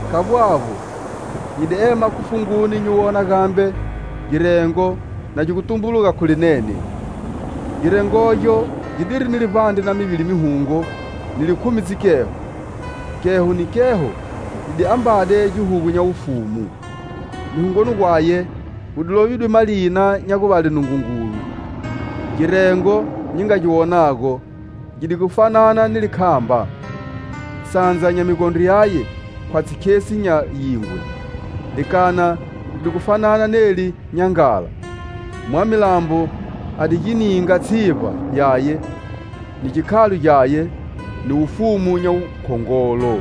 Khavbo avbo, nyi di ema khu funguni nyi wona gambe girengo na gi tumbuluga khu linene. Girengogyo gidiri ni livbandre na mivili mihungo ni likhumi dzikheho, kheho ni kheho yi di ambade gihugu nya wufumu. Mihungoni gwaye gu di lovidwe malina nya guvale Nungungulu. Girengo nyi nga gi wonago gi di gu fanana ni likhamba. Sandza nya migondro yaye khwatshi khesi nya yingwe, likana li di gu fanana neli nya nghala. Mwamilambo a di gi ninga tshivba yaye, ni gikhalo gyaye, ni wufumu nya wukhongolo.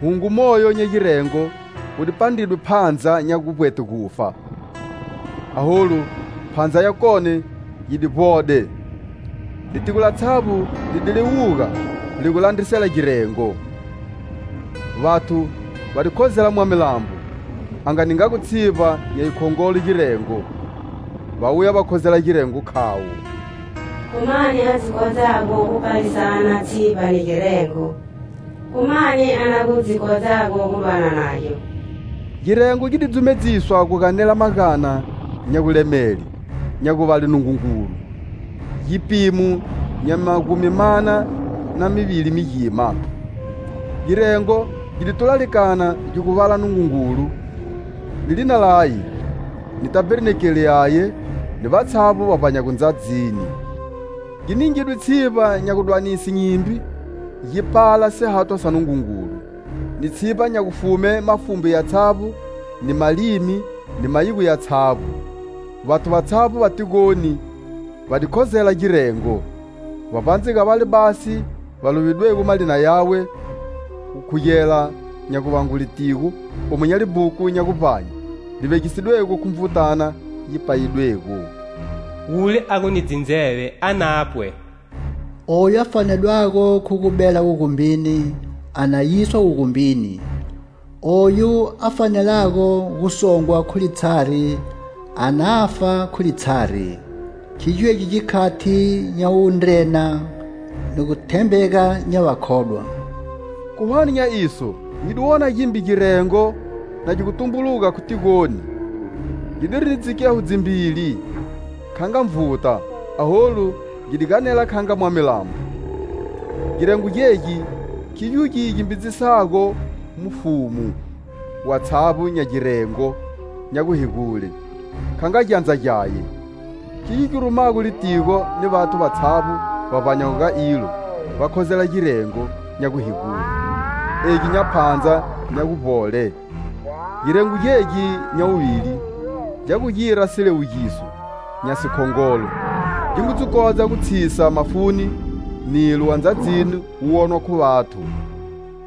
Hungo moyo nya girengo wu di pandridwe phandza nya guvbwete gufa. Aholu, phandza yakone yi di vbode. Litigo latshavbo li di liwuga li gu landrisela girengo. Vathu va di khozela mwamilambo a nga ningago tshivba nya yi khongolo girengo. Va wuya va khozela girengo khavo: "Khu mani a dzi kodzago gu palisana tshivba ni girengo,khu mani a na gu dzi kodzago gu dwana nagyo?" Girengo gi di dzumedziswa gu ganela magana nya gulemele, nya guvale Nungungulu, gipimo nya magumi mana na mivili migima. Girengo gi di tula likana gi gu vala Nungungulu ni lina laye, ni tabernakele yaye ni vatshavbo va vbanyago ndzadzini. Gi ningidwe tshivba nya gudwanise nyimbi gi pala sihathwa sa Nungungulu, ni tshivba nya gufume mafumbu yatshavbo, ni malimi, ni mayigo yatshavbo. Vathu vatshavbo va tigoni va di khozela girengo, vbavbandze ga vale basi va lovedwego malina yawe, gu khugela nya guvangwe litigo, omu nya libhuku nya guvbanye li vegisidwego khu Nvutana yi payidwego. Wule a gu ni dzindzeve a napwe. Oyu a fanedwago khu gu bela wugumbini a na yiswa wugumbini, oyu a fanelago gu songwa khu litshari a nafa khu litshari. Khigyo egi gikhati nya wundrena ni gu thembega nya vakhodwa. Khu hwane nya iso nyi di wona gimbe girengo na gi gu tumbuluga khu tigoni gidiri ni dzikheho dzimbili kha nga nvuta aholu gi di ganela kha nga mwamilambo. Girengo gegi khigyo gi gimbidzisago mufumu watshavbo nya girengo nya guhegule kha nga gyandza gyaye; khigyo gi rumago litigo ni vathu vatshavbo va vbanyago ga ilo va khozela girengo nya guhegule, egi nya phandza nya guvbole. Girengo gegi nya wuvili gya gu gira siliwugiso nya sikhongolo. Gi ngu dzi kodza gu tshisa mafuni nilo wa ndzadzini wu wonwa khu vathu.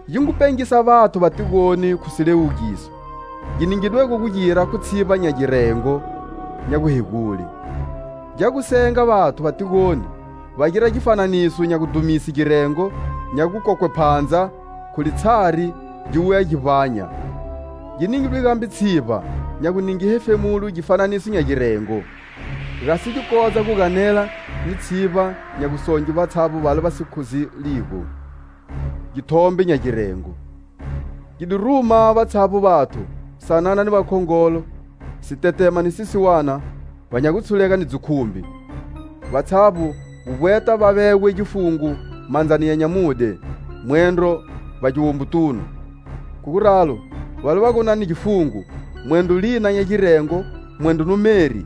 Gi ngu pengisa vathu va tigoni khu siliwugiso gi ningidwego gu gira khu tshivba nya girengo nya guhegule. Gya gu senga vathu va tigoni va gira gifananiso nya gudhumise girengo nya gukokwe phandza khu litshari gi wuya gi vbanya. Gi ningidwe gambe tshivba nya gu ninge hefemulo gifananiso nya girengo, gasi gi kodza gu ganela ni tshivba nya gusonge vatshavbo vale va si khozeligo githombe nya girengo. Gi di ruma vatshavbo vathu, sanana ni vakhongolo, sitetema ni sisiwana va nya gutshulega ni dzikhumbi, vatshavbo gu vbweta va vegwe gifungo mandzani ya nyamudye, mwendro vbagiwombotunu. Khu guralo, vale va gu ni gifungo, mwendro lina nya girengo, mwendro numeri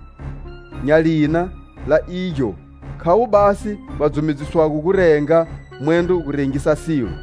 nya lina la igyo khavo basi va dzumedziswago gu renga mwendro gu rengisa silo.